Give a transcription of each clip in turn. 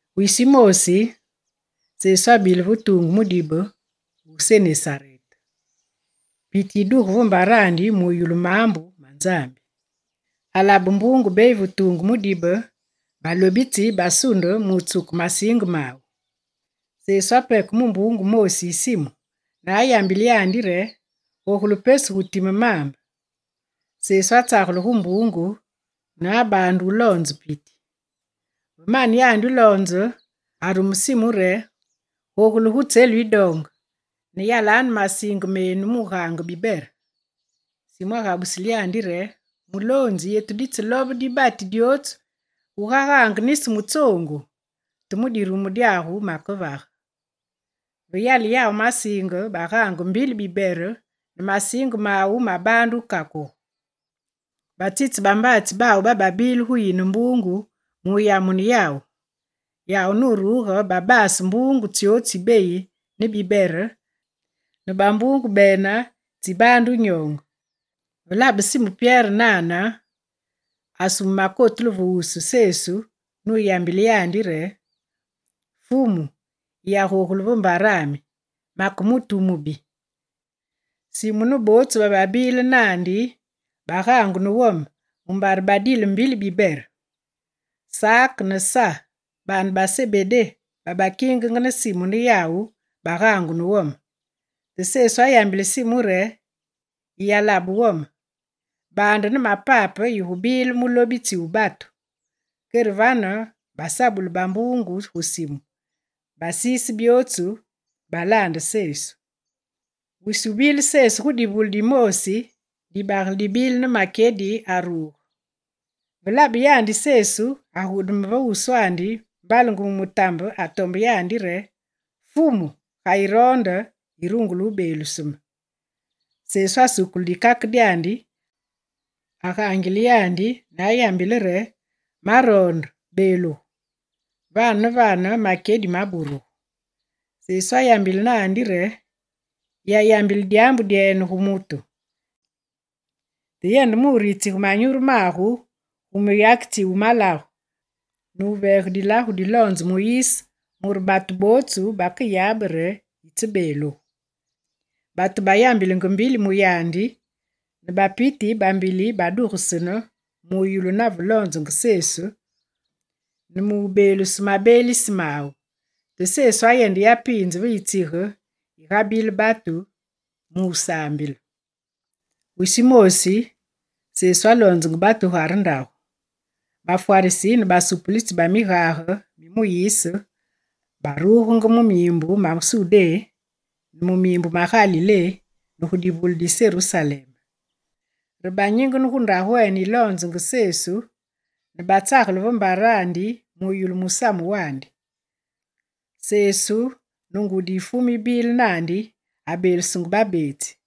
Wisi wumoosi, Sesu abile ve tuungu mudibe wu Senesarete. Piti yiduge ve mbarandi mu yulu maambu ma Nzambi. Alabe mbuungu beyi ve tuungu mudibe, balobitsi basunde mutsuke masiinge mawu. Sesu apeke mu mbuungu moosi yi Simu, ne ayambile yandi re gogule pesu gu time maambe. Sesu atsagele gu mbuungu ne abaande wuloonze piti. Ve mane yandi wuloonze, arume Simu re: «Gogule gu tselu yidoonge, ne yalanu masiinge menu mu wugaange bibere.» Simu agabusile yandi re: «Muloonzi, yetu ditselobe dibati dyootsu gugagaange nisi mutsoongu; te mu dirumu dyagu makevage.» Ve yale yawu masiinge, bagaange mbili bibere ne masiinge mawu mabaande wukakuge. Batsitse bambaatsi bawu bababile gu yine mbuungu mu wuyamune yawu. Yawu nuruge babaase mbuungu tsyootsu tsibeyi ne bibere, ne bambuungu bene tsibaande wunyoonge. Ve labe Simu Pyere nane, asume makotulu ve wusu Sesu nuyambile yandi re: «Fumu, yiyagogule ve mbarami, make mutu wu mubi!» Simu ne bootsu bababile naandi bagaangu ne wome mumbare badile mbili bibere. Sak ne Sa baane ba Sebedé babakingenge ne Simu ne yawu bagaangu ne wome. Te Sesu ayambile Simu re: «Yiyalabe wome, baande ne mapape yigubile mulobitsi wu batu.» Kere vane basabule bambuungu gu simu, basiise byootsu, balaande Sesu. Wisi wubile Sesu gu divule dimoosi, dibagele dibile ne makyedi aruge. Ve labe yandi Sesu, agudeme ve wuswandi mbalenge mu mutambe atombe yandi re: «Fumu, ga yiroonde, yirungule wubeeluse me.» Sesu asukule dikake dyandi, agaangile yandi ne ayambile re: «Maroonde, beelugu.» Vane ne vane makyedi maburugu. Sesu ayambile naandi re: «Yiyayambile dyaambu dyene gu mutu, te yende mu wuritsige manyuru magu gu muyakitsi wu malagu, nuveege dilagu diloonze Muyise mure batu bootsu bakeyabe re yitsebeelugu.» Batu bayambilenge mbili mu yandi, ne bapiti bambili badugesene mu yulu nave loonzenge Sesu, ne mu wubeelusu mabeelise mawu. Te Sesu ayende yapiinze ve yitsige gigabile batu, mu wusaambile. Wisi wumoosi Sesu aloonzenge batu gugare ndagu. Bafwarisi ne basupulitsi ba migage mi Muyise barugenge mu miimbu ma Sudé, ne mu miimbu ma Galilé, ne gu divule di Serusalem. Re banyingene gu ndagwene yiloonzenge Sesu, ne batsagele ve mbarandi mu wuyulu musamu wandi. Sesu ne ngudi yi Fumu yibile naandi, abeelusenge babeetsi.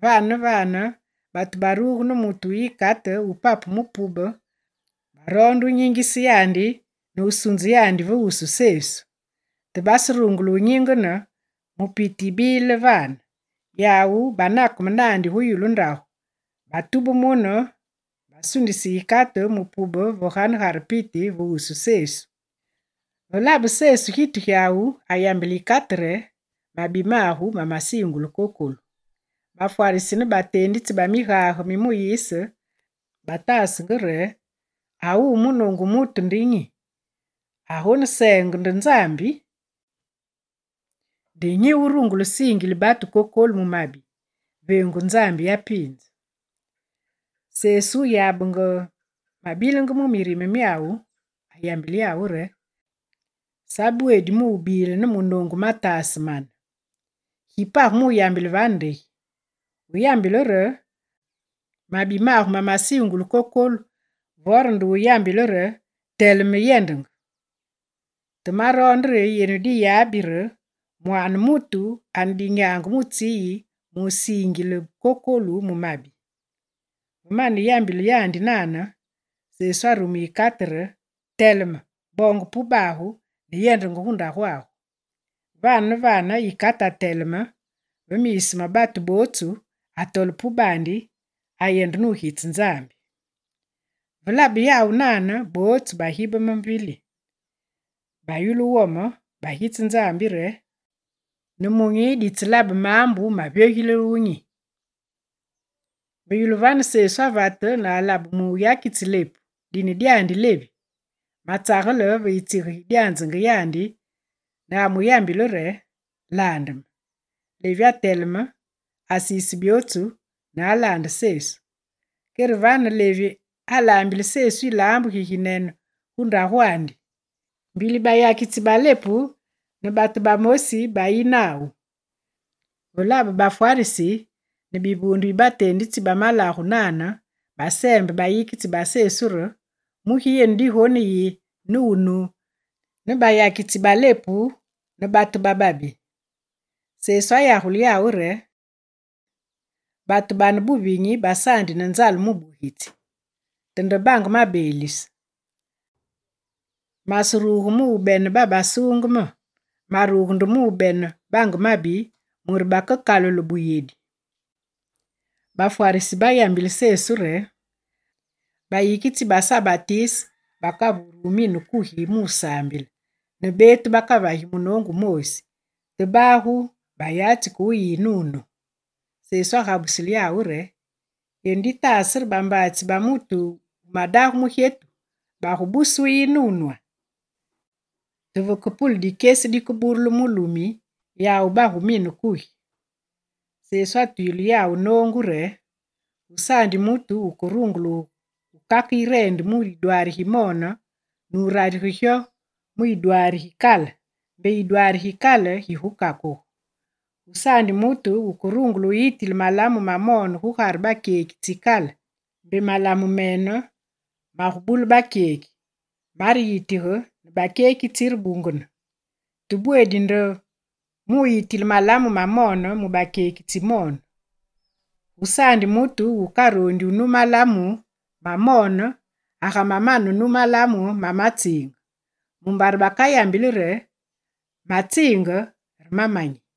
Vane ne vane batu baruge ne mutu wu yikate wupapu mu pube, baroonde wunyingise yandi ne wusunze yandi ve wusu Sesu. Te baserungule wunyingene mu piti yibile vane, yawu banakeme naandi gu yulu ndagu, batube mune, basundise yikate mu pube ve ganegare piti ve wusu Sesu. Ve labe Sesu gitu gyawu, ayambile yikate re: «Mabi magu mamasiingulu kokolu.» Bafwarisi ne bateenditsi ba migage mi Muyise bataasenge mu mirime re: «A wuwu munoongu mutu nde nyi? Agoneseenge nde Nzambi! Nde nyi wurungule wusiingile batu kokolu mu mabi veengu Nzambi yapiinze!» Sesu wuyabenge mabilenge mu mirime myawu, ayambile yawu re: «Sabweedi mu wubile ne munoongu mataase mane. Gi page mu wuyambile vane nde gi? Wuyambile re: “Mabi magu mamasiingulu kokolu”, vore nde wuyambile re: “Teleme, yendenge?” Te maroonde re yenu diyabi re, Mwaane mutu ane dinyaange mu tsi yi musiingile kokolu mu mabi.» Ve mane wuyambile yandi nane, Sesu arume yikate re: «Teleme, boonge pubagu, ne yende gu ndagwagu!» Vane ne vane yikate ateleme ve miisu ma batu bootsu, atole pubandi, ayende nugitse Nzambi. Ve labe yawu nane, bootsu bagibeme mbili. Bayulu wome, bagitse Nzambi re: «Nemunyi ditselabe maambu mavyogilile wunyi!» Ve yulu vane, Sesu avate ne alabe muyakitsi lepu, dine dyandi: Levi, matsagele ve yitsige gidyanzenge yandi, ne amuyambile re: «Laande me!» Levi ateleme, asiise byootsu, ne alaande Sesu. Kere vane Levi alaambile Sesu yilaambu giginene gu ndagwandi, mbili bayakitsi balepu ne batu bamosi bayi nawu. Ve labe bafwarisi ne bivuunde bi bateenditsi ba migage nane, baseembe bayikitsi ba Sesu re: «Mugi yenu digoneyi, ne wunu ne bayakitsi ba lepu, ne batu bababi?» Sesu ayagule yawu re: «Batu babane buvinyi basaandi ne nzale mubugitsi, te nde bange mabeelise. Maseruge mu wubene babasuungeme, maruge nde mu wubene bange mabi, mure bakekalule buyedi.» Bafwarisi bayambile Sesu re: «Bayikitsi ba Sa Batise bakavure mine kugi ne wusaambile, ne beetu bakavagi munoongu wumoosi, te bagu bayatsi ke wuyi ne wunu.» Sesu agabusile yawu re: «Yenu ditaase re bambaatsi ba mutu wumadage mugyetu bagubuse wuyi ne wunwa? Te vekepule dikyesi dikeburulu mulumi, yawu bagumine kugi.» Sesu atwile yawu noongu re: «Gusaandi mutu wukerungule wukake yireende mu yidwaari gimoone nurarige gyo mu yidwaari gikale, mbe yidwaari gikale gigukakugu. Gusaandi mutu wukerungule wuyitile malamu mamoone gugare bakyeki tsikale, mbe malamu mene magubule bakyeki, mareyitige, ne bakyeki tsirebungene. Te bweedi nde wuyitile malamu mamoone mu bakyeki tsimoone. Gusaandi mutu wukaroondi wunu malamu mamoone agamamane wunu malamu mamatsiinge. Mumbare bakayambili re: “Matsiinge, re mamanyi.”»